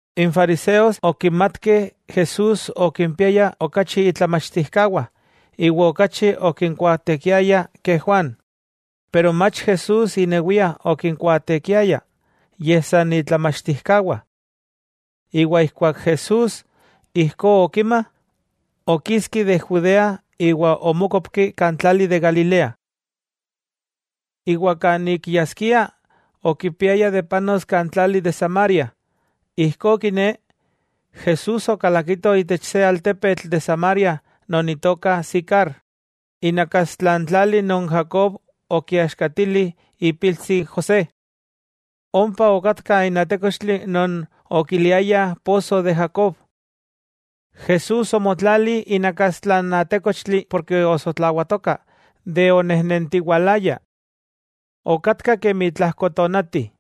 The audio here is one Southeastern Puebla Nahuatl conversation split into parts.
N fariseos okimatkeh Jesús okimpiaya okachi itlamachtijkawah iwa okachi okinkuaatekiaya ke Juan. Pero Jesús amaka okikuaateki, yej san itlamachtijkawah. Ijkuak Jesús ijkó okima, okiski de Judea iwa omókopki kan tlali de Galilea. Iwa kan ik yaskia, okipiaya de panos kan tlali de Samaria. Ijkó kiné, Jesús okalakito itech se altepetl de Samaria non itoka Sicar, inakastla n tlali non Jacob okiaxkatili ipiltsi José. Ompa okatka n atékochtli non okiliayah poso de Jacob. Jesús omotlali inakastla n atékochtli porke osotlawatoka de onejnentiwalaya. Okatka kemi tlajko tonati.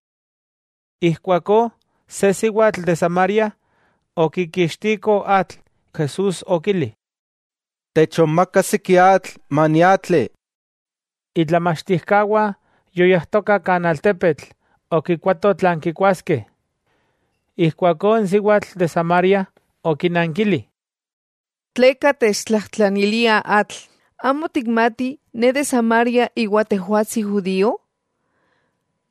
Ijkuakó se siwatl de Samaria okikixtiko atl, Jesús okili: —Techonmaka siki atl, maniatli. Itlamachtijkawah yoyajtokah kan altepetl okikuatoh tlan kikuaskeh. Ijkuakó n siwatl de Samaria okinankili: —¿Tleka techtlajtlanilia atl, amo tikmati ne de Samaria iwa tejwatsi judío?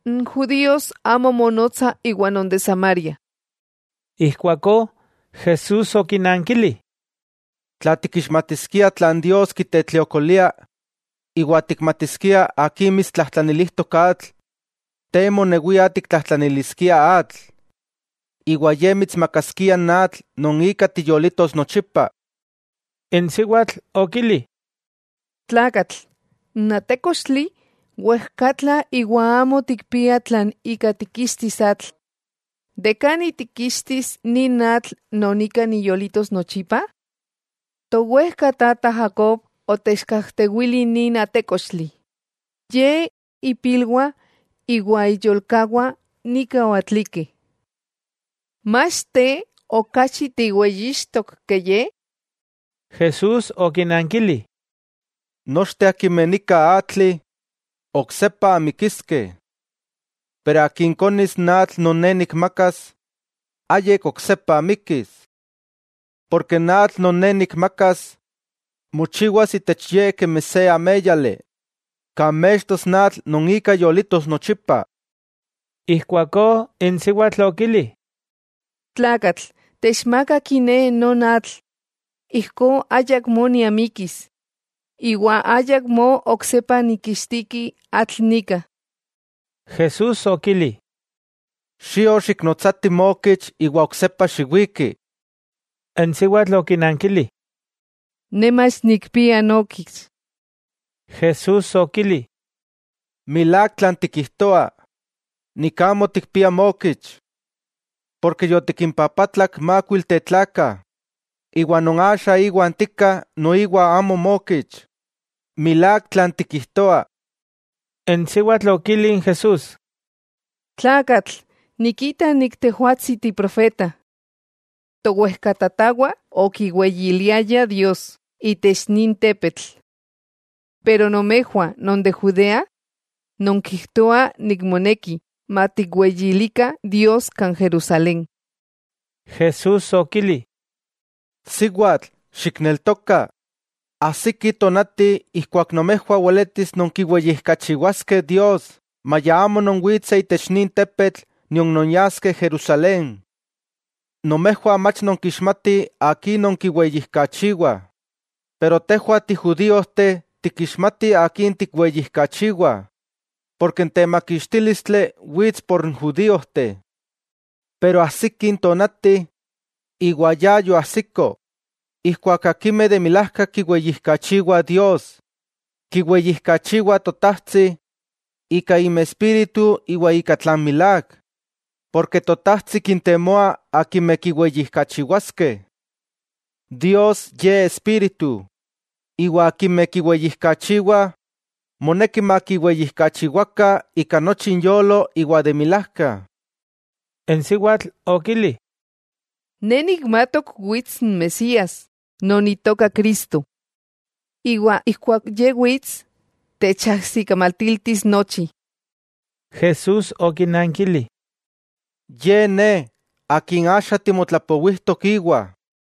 N judíos amo monotsah iwa non de Samaria. Ijkuakó Jesús okinankili: —Tla tikixmatiskia tlan Dios kitetliokolia iwa tikmatiskia akin mitstlajtlanilijtok atl, te monewia tiktlajtlaniliskia atl, iwa Ye mitsmakaskia n atl non ika tiyolitos nochipa. N siwatl okili: —Tlakatl, n atékochtli wejkatla iwa amo tikpia tlan ika tikixtis atl. ¿Kan tikixtis nin atl non ika niyolitos nochipa? Towejkatata Jacob otechkajtewili nin atékochtli. Ye, ipilwah iwa iyolkawah nika oatlikeh. ¿Mach te okachi tiweyixtok ke ye? Jesús okinankili: —Nochteh akimeh nika atlih, oksepa amikiskeh, pero akin konis n atl non Ne nikmakas, ayik oksepa amikis. Porke n atl non Ne nikmakas, mochiwas itech ye kemi se améyali, kan mextos n atl non ika yolitos nochipa. Ijkuakó n siwatl okili: —Tlakatl, techmaka kiné non atl, ijkó ayakmó niamikis, iwa ayakmó oksepa nikixtiki atl nika. Jesús okili: —Xio xiknotsati mookich iwa oksepa xiwiki. N siwatl okinankili: —Ne mach nikpia nookich. Jesús okili: —Milák tlan tikijtoa, nik amo tikpia mookich, porke yotikimpapatlak mákuilteh tlakah, iwa non axa iwan tika noiwa amo mookich. Milák tlan tikijtoa. N siwatl okili n Jesús: —Tlakatl, nikita tejwatsi tiprofeta. Towejkatatawah okiweyiliayah Dios itech nin tepetl. Pero nomejwah non de Judea nonkijtoah moneki matikweyilikah Dios kan Jerusalén. Jesús okili: —Siwatl, xikneltoka, ajsiki tonati ijkuak nomejwah weletis nonkiweyijkachiwaskeh Dios maya amo nonwitseh itech nin tepetl nion nonyaskeh Jerusalén. Nomejwah mach nonkixmatih akin nonkiweyijkachiwah, pero tejwah tijudíojteh tikixmatih Akin tikweyijkachiwah, porke n temakixtílistli wits por n judíojteh. Pero ajsiki n tonati, iwa ya yoajsiko, ijkuak akimeh de milajka kiweyijkachiwah Dios, kiweyijkachiwah Totajtsi ika inmespíritu iwa ika tlan milák, porke Totajtsi kintemoa akimeh kiweyijkachiwaskeh. Dios, Ye Espíritu, iwa akimeh kiweyijkachiwah moneki makiweyijkachiwakah ika nochi inyolo iwa de milajka. N siwatl okili: —Ne nikmatok wits n Mesías —non Itoka Cristo—, iwa ijkuak Ye wits, techajsikamatiltis nochi. Jesús okinankili: —Ye Ne, Akin axa timotlapowijtok íwa.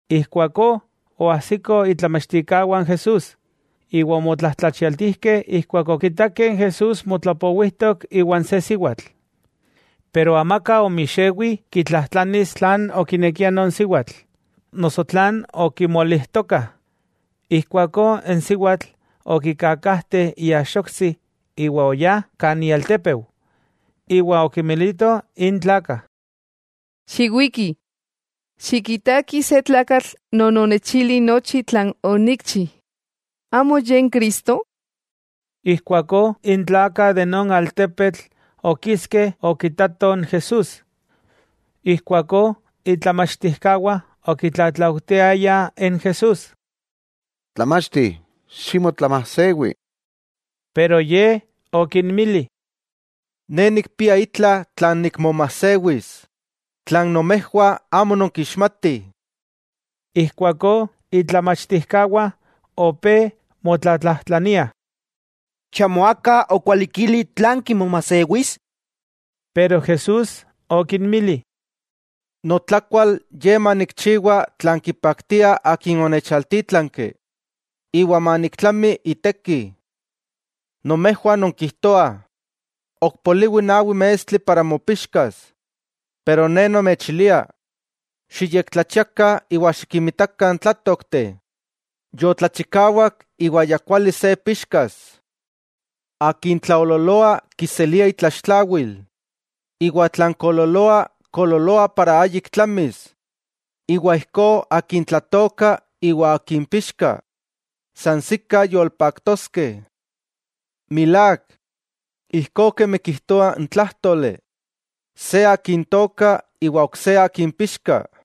Ijkuakó oajsikoh itlamachtijkawah n Jesús iwa omotlajtlachialtijkeh ijkuak okitakeh n Jesús motlapowijtok iwan se siwatl. Pero amaka omixewi kitlajtlanis tlan okinekia non siwatl, noso tlan okimolijtokah. Ijkuakó n siwatl okikakajte iaxoktsi iwa oyá kan ialtépeu, iwa okinmilito n tlakah: —Xiwikih, xikitakih se tlakatl non onechili nochi tlan onikchi. ¿Amo Ye n Cristo? Ijkuakó n tlakah de non altepetl okiskeh okitatoh n Jesús. Ijkuakó itlamachtijkawah okitlatlaujtiayah n Jesús: —Tlamachti, ximotlamasewi. Pero Ye okinmili: —Ne nikpia itla tlan nikmomajsewis tlan nomejwah amo nonkixmatih. Ijkuakó itlamachtijkawah opé motlatlajtlaniah: —¿Chamo aka okwalikili tlan kimomajsewis? Pero Jesús okinmili: —Notlakual ye manikchiwa tlan kipaktia Akin onechaltítlanki, iwa maniktlami iteki. Nomejwah nonkijtoah: “Ok poliwi nawi mestli para mopixkas.” Pero Ne nomechilia: Xiyektlachiakah iwa xikimitakah n tlátookteh, yotlachikawak iwa ya kuali se pixkas. Akin tlaoololoa kiselia itlaxtlawil, iwa tlan koololoa, koololoa para ayik tlamis, iwa ijkó akin tlatooka iwa akin pixka, sansikah yolpaktoskeh. Milák, ijkó kemi kijtoa n tlájtoli: “Se akin tooka, iwa ok se akin pixka.”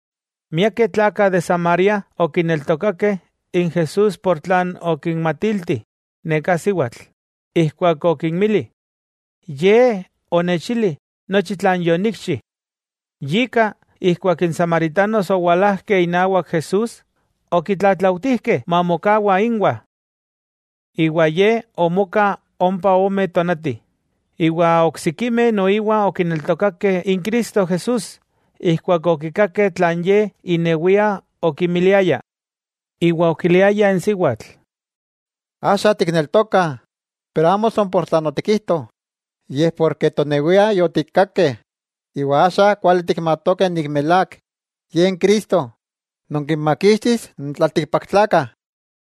Miakeh tlakah de Samaria okineltokakeh n Jesús por tlan okinmatilti neká siwatl, ijkuak okinmili: “Ye onechili nochi tlan yonikchi.” Yika ijkuak n samaritanos owalajkeh inawak Jesús, okitlatlautijkeh mamokawa ínwah. Iwa Ye omoka ompa ome tonati, iwa oksikimeh noiwa okineltokakeh n Cristo Jesús ijkuak okikakeh tlan Ye inewia okimiliaya. Iwa okiliayah n siwatl: —Axa tikneltokah pero amo san por tlan otikijto, yej porke tonewiah yotikkakeh, iwa axa kuali tikmatokeh milák Ye n Cristo, non kinmakixtis n tlaltikpaktlakah.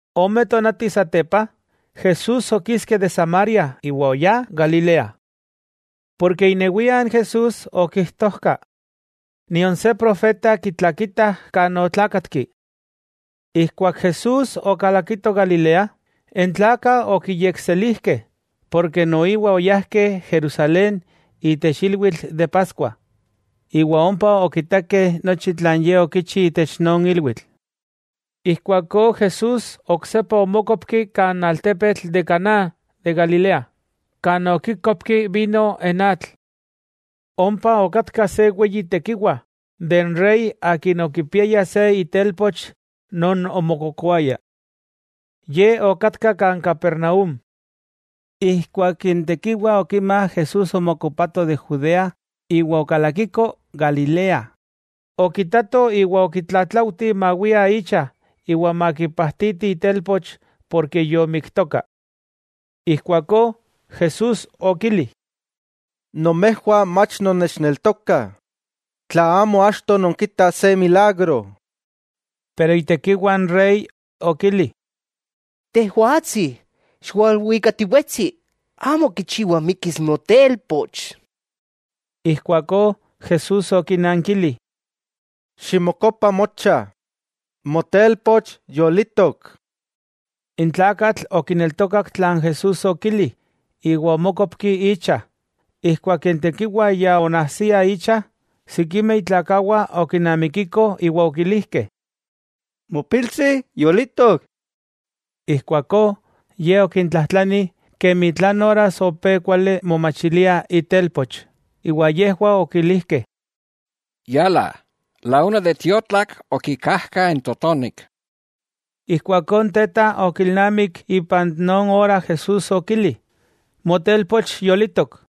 Ome tonati satepa, Jesús okiski de Samaria iwa oyá Galilea. Porke inewia n Jesús okijtojka, nion se profeta kitlakitah kan otlakatki. Ijkuak Jesús okalakito Galilea, n tlakah okiyekselijkeh, porke noiwa oyajkeh Jerusalén itech ilwitl de Paskua, iwa ompa okitakeh nochi tlan Ye okichi itech non ilwitl. Ijkuakó Jesús oksepa omókopki kan altepetl de Caná de Galilea, kan okikopki vino n atl. Ompa okatka se tekiwa de n rey akin okipiaya se itelpoch non omokokoaya. Ye okatka Capernaúm. Ijkuak n tekiwa okima Jesús omokopato de Judea iwa okalakiko Galilea, okitato iwa okitlatlaujti mawia icha iwa makipajtiti itelpoch porke yomiktoka. Ijkuakó Jesús okili: —Nomejwah mach nonnechneltokah, tla amo achto nonkitah se milagro. Pero itekiwa n rey okili: —Tejwatsi, xiwalmuikatiwetsi, amo kichiwa mikis notelpoch. Ijkuakó Jesús okinankili: —Ximokopa mocha, motelpoch yolitok. N tlakatl okineltokak tlan Jesús okili, iwa omókopki icha. Ijkuak n tekiwa ya onajsia icha, sikimeh itlakawah okinamikikoh iwa okilijkeh: —Mopiltsi yolitok. Ijkuakó ye okintlajtlani kemi tlan oras opé kuali momachilia itelpoch, iwa yejwah okilijkeh: —Yala, la una de tiotlak, okikajka n totonik. Ijkuakó n teta okilnamik ipan non ora Jesús okili: “Motelpoch yolitok.”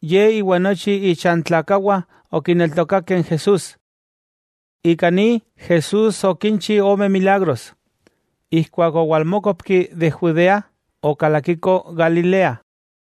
Ye iwa nochi ichantlakawah okineltokakeh n Jesús. Ika ni, Jesús okinchi ome milagros, ijkuak owalmókopki de Judea iwa okalakiko Galilea.